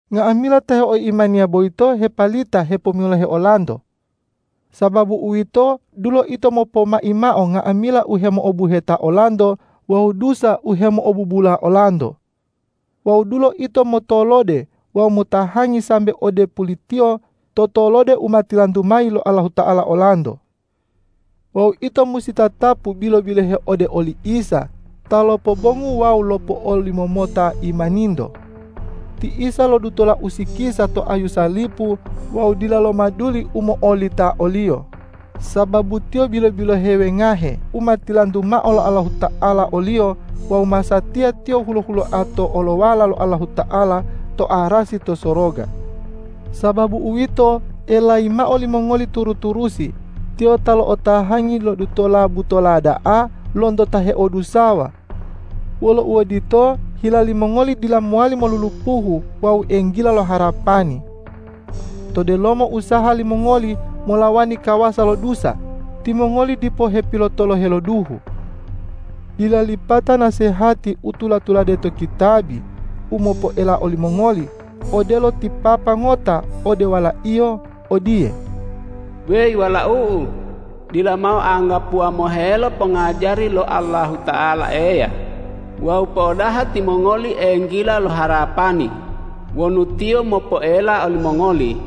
Nga'amila ta heoimaniya boyito hepalita hepomilohe olanto. Sababu uwito, dulo ito mopomai mao nga'amila u hemo'obuheta olanto wawu dusa u hemo'obubula olanto. Wawu dulo ito motolode wawu motahangi sambe ode pulitiyo to tolode u ma tilantu mayi lo Allahuta'ala olanto. Wawu ito musi tatapu bilo-bilohe ode oli Isa ta lopobongu wawu lopo'olimomota imaninto. Ti Isa lodutola usikisa to ayu salipu wawu dila lomaduli u mo'olita o-Liyo, sababu Tiyo bilo-bilohe wengahe u ma tilantu mao lo Allahuta'ala o-Liyo wawu masatiya Tiyo hulo-huloa to olowala lo Allahuta'ala to arasi to soroga. Sababu uwito, elayi mao limongoli turu-turusi, Tiyo ta lo'otahangi lodutola butola da'a lonto ta heodusawa. Wolo uodito, hila limongoli dila mowali molulupuhu wawu enggila lo harapani. To delomo usaha limongoli molawani kawasa lo dusa, timongoli dipo hepilotolohe lo duhu. Dila lipata nasehati u tula-tulade to kitabi u mopoela olimongoli, odelo ti papa ngota ode walaiyo odiye,”Weyi walau'u, dila mao anggapuwa mohelo pongajari lo Allahuta'ala Eya wawu po'odaha timongoli enggila lo harapani wonu Tiyo mopoela olimongoli,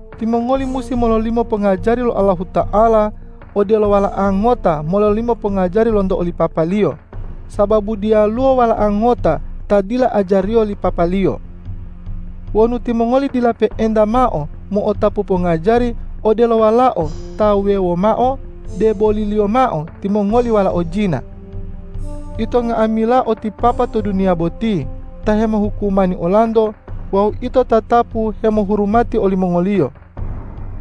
Timongoli musi mololimo pongajari lo Allahuta'ala, odelo wala'a ngota mololimo pongajari lonto oli papaliyo, sababu diyaluwo wala'a ngota ta dila ajariyo li papaliyo. Wonu timongoli dila pe'enta mao mo'otapu pongajari odelo walao ta wuwewo mao, deboliliyo mao timongoli walao jina. Ito nga'amila o ti papa to duniya boti ta hemohukumani olanto wawu ito tatapu hemohurumati olimongoliyo.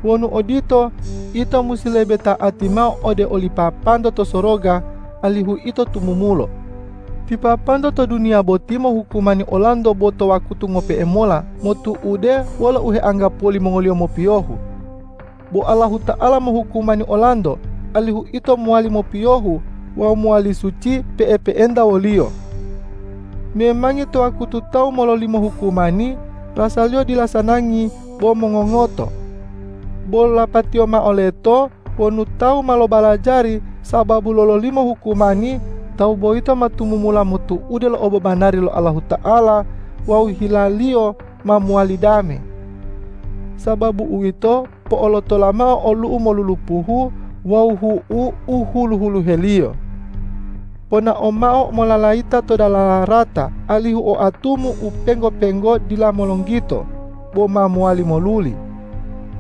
Wonu odito, ito musi lebe ta'ati mao ode oli Papanto to soroga, alihu ito tumumulo. Ti papanto to duniya boti mohukumani olanto bo to wakutu ngope'e mola motu'ude wolo u heanggapuwo limongoliyo mopiyohu. Bo Allahuta'ala mohukumani olanto, alihu ito mowali mopiyohu wawu mowali suci pe'epe'enta wo-Liyo. Memangi to wakutu tawu mololimo hukumani, rasaliyo dila sanangi bo mongongoto. Bo lapatiyo mao leto wonu tawu ma lobalajari sababu lololimo hukumani, tawu boyito ma tumumula motu'ude lo obobanari lo Allahuta'ala wawu hilaliyo ma mowali dame. Sababu uwito, po'olotola mao olu'u molulupuhu wawu hu'u u hulu-huluheliyo. Ponao mao mololayita to dalala rata, alihu oatumu u penggo-penggo dila molonggito, bo ma mowali moluli.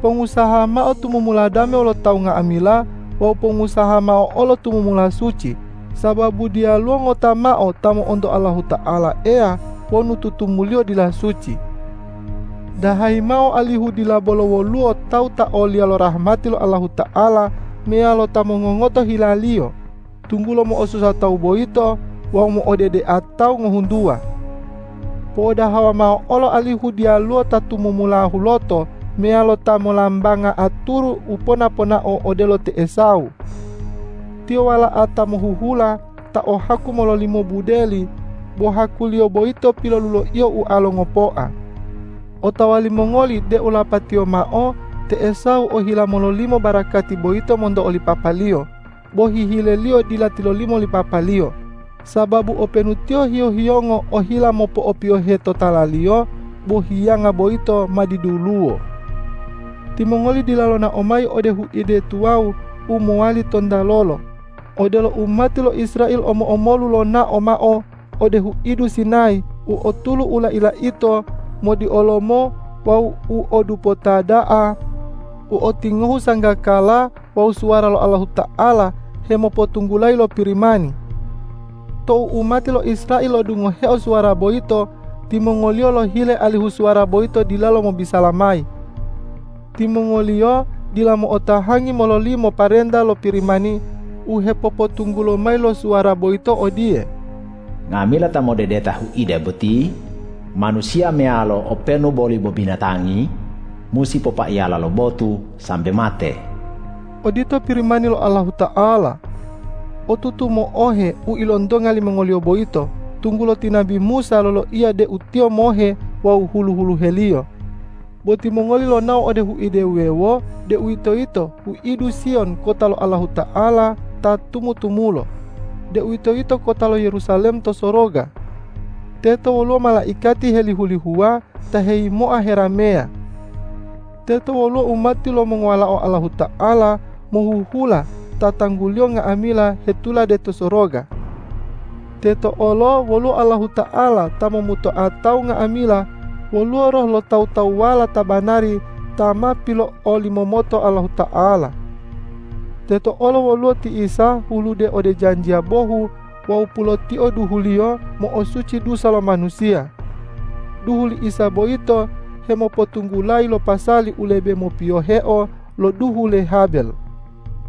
Pongusaha mao tumumula dame wolo tawu nga'amila wawu pongusaha mao olo tumumula suci, sababu diyaluwo ngota mao ta mo'onto Allahuta'ala Eya wonu tutumuliyo dila suci. Dahayi mao alihu dila bolo woluwo tawu ta oliya lo rahmati lo Allahuta'ala meyalo ta mongongoto hilaliyo, tunggulo mo'osusa tawu boyito wawu mo'odedea tawu ngohuntuwa. Po'odahawa mao olo alihu diyaluwo ta tumumula huloto meyalo ta molambanga aturu u pona-ponao odelo te Esawu. Tiyo wala'a ta mohuhula ta o haku mololimo budeli, bo hakuliyo boyito piloluloiyo ualo ngopoa. Otawa limongoli deu lapatiyo mao te Esawu ohila mololimo barakati boyito monto oli papaliyo, bo hihileliyo dila tilolimo li papaliyo; sababu openu tiyo hiyo-hiyongo ohila mopo'opiyohe totalaliyo, bo hiyanga boyito ma diduluwo. Timongoli dila lonao mayi ode huide tuwawu u mowali tontalolo, odelo umati lo Israel omo-omolu lonao mao ode huidu Sinayi u o tulu u lai-laito, modiolomo wawu u o dupota da'a, u o tingohu sanggakala wawu suwara lo Allahuta'ala hemopotunggulayi lo Pirimani. Tou umati lo Israel lo'odungoheo suwara boyito, timongoliyo lohile alihu suwara boyito dilalo mobisala mayi. Timongoliyo dila mo'otahangi mololimo parenta lo Pirimani u hepopotunggulo mayi lo suwara boyito odiye,”Nga'amila ta modedeta huide boti, manusiya meyalo openu boli bo binatangi, musi popaiyala lo botu sambe mate.” Odito Pirimani lo Allahuta'ala. Otutu mo'ohe u ilontonga limongoliyo boyito, tunggulo ti nabi Musa loloiya deu tiyo mohe wawu hulu-huluheliyo. Bo timongoli lonao ode huide wuwewo, deuwitoyito huidu Siyon kota lo Allahuta'ala ta tumu-tumulo, deuwitoyito kota lo Yerusalem to soroga. Teto woluwo malaikati helihu-lihuwa ta heyimoa herameya. Teto woluwo umati lo mongowalao Allahuta'ala mohuhula ta tangguliyo nga'amila hetulade to soroga. Teto olo woluwo Allahuta'ala ta momutoa tawu nga'amila, woluwo roh lo tawu-tawuwala ta banari ta ma pilo'olimomoto Allahuta'ala. Teto olo woluwo ti Isa hulude ode janjiya bohu wawu pulotio duhu-Liyo mo'osuci dusa lo manusiya. Duhu li Isa boyito hemopotunggulayi lo pasali u lebe mopiyoheo lo duhu le Habel.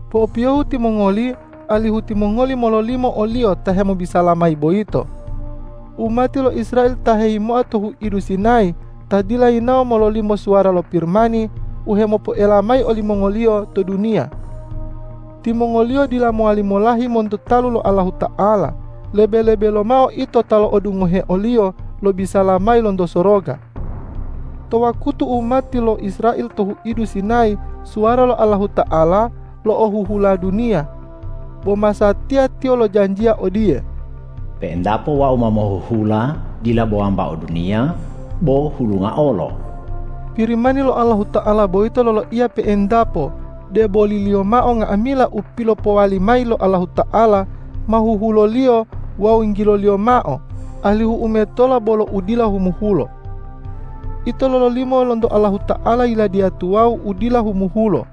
Po'opiyohu timongoli alihu timongoli mololimo o-Liyo ta hemobisala mayi boyito. Umati lo Israel ta heyimoa to huidu Sinayi ta dila yinawo mololimo suwara lo Pirimani u hemopoela mayi olimongoliyo to duniya. Timongoliyo dila mowali molahi monto talu lo Allahuta'ala, lebe-lebe lomao ito ta lo'odungohe o-Liyo lobisala mayi lonto soroga. To wakutu umati lo Israel to huidu Sinayi, suwara lo Allahuta'ala lo'ohuhula duniya. Bo masatiya Tiyo lojanjiya odiye,”Pe'entapo Wau ma mohuhula dila bo wambao duniya bo hulunga olo.” Pirimani lo Allahuta'ala boyito loloiya pe'entapo, deboliliyo mao nga'amila u pilopowali mayi lo Allahuta'ala ma huhulo-Liyo wawu yinggilo-Liyo mao, alihu u metola bolo u dila humuhulo. Ito lololimo lonto Allahuta'ala Yiladiya tuwawu u dila humuhulo.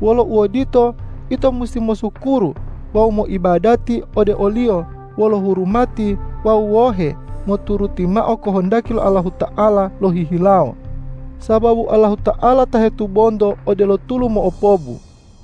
Wolo uodito, ito musi mosukuru wawu moibadati ode o-Liyo wolo hurumati wawu wohe moturuti mao kohondaki lo Allahuta'ala lohihilawo, sababu Allahuta'ala ta hetubonto odelo tulu mo'opobu.